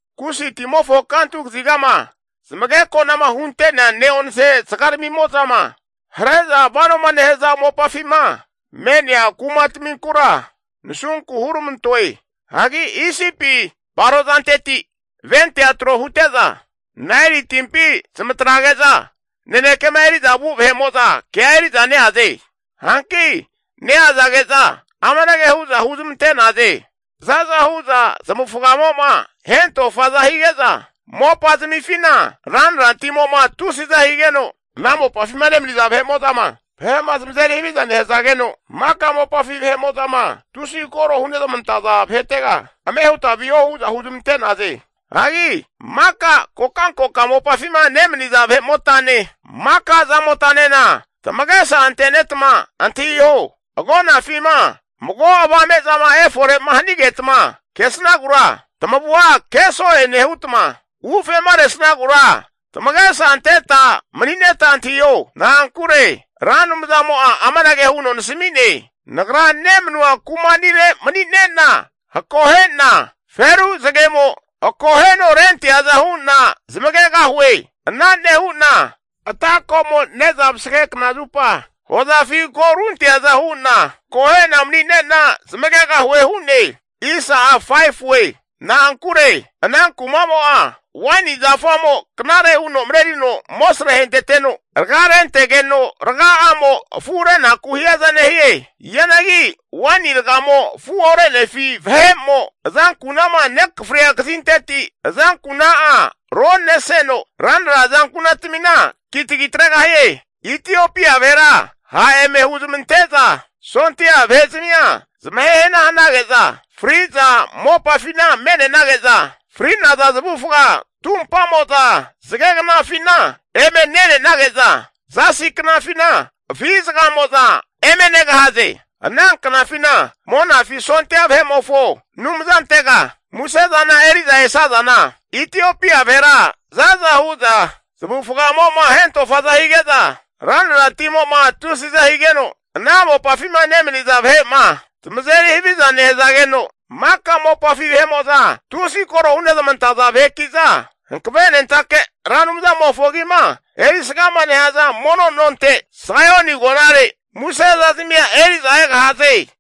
Kusi timofo kantu kazigama zamageko'nama hunte'nea ne'onse zagaramimo'zama hare'za vanoma nehaza mopafima me'nea kumataminkura nasunku huramantoe. Hagi Isipi vahe'mo'za barozanteti ventea tro hute'za, Naeli timpi zamatrage'za nanekema eri'za vu vahe'mo'za kea eri'za neaze. Hanki neazage'za amanage hu'za huzmante'naze, zaza hu'za zamavufagamo'ma hentofaza hige'za, mopa'zamifina ranra timo'ma tusiza higeno, ana mopafima nemaniza vahe'mo'zama, vahe'ma zamazeri haviza nehazageno maka mopafi vahe'mo'zama tusi koro hunezmantaza vahetega, ame huta viho hu'za huzmante'naze. Hagi maka kokankoka mopafima nemaniza vahe'motane, maka zamotanena tamagesa antetma antahiho, agonafima mago avame'zama efore'ma hanigetma kesnagura tamavua keso'e nehutma, ufema resnagura tamagesa anteta manineta antahiho. Na'ankure Ra Anumzamo'a amanage huno nasami'ne, Nagra nemanua kuma'nire mani'ne'na akohe'na, feru zagemo akoheno renteaza hu'na zamagegahue. Ana nehu'na ata ko'mo ne'za vasage knazupa hozafi ko runteaza hu'na, akohe'na maninena zmagegahue hu'ne. Na'ankure ana kumamo'a, waini zafamo knare huno marerino amosre ahenteteno, raga rentegeno raga'amo afurenaku hiaza nehie. Hianagi waini ragamo afu orenefi vahe'mo, azanku'nama nekafria kazinteti azankunatamin'a roneseno ranra azankunatamina kitagi atregahie. Itiopia vahera ha' eme huzmante'za sondia vahe'zamia zamahe hana hanage'za fri'za mopafina me'nenage'za, fri'naza zamavufaga tumpamo'za zagegnafina eme ne'nenage'za, zasi knafina afi zagaramimo'za eme negahaze. Ana knafina Monafi sondia vahe'mofo Anumzantega musezana eri'za esazana, Itiopia vahera zaza hu'za, zamavufagamo'ma hentofaza hige'za, ranra timo'ma tusiza higeno, ana mopafima nemaniza vahe'ma zamazeri haviza nehazageno, maka mopafi vahe'mo'za tusi koro hunezmantaza vaheki'za Hankavenentake Ra Anumzamofo agima erisgama nehaza mono nonte, Saioni agonare muse zazamia eri'za egahaze.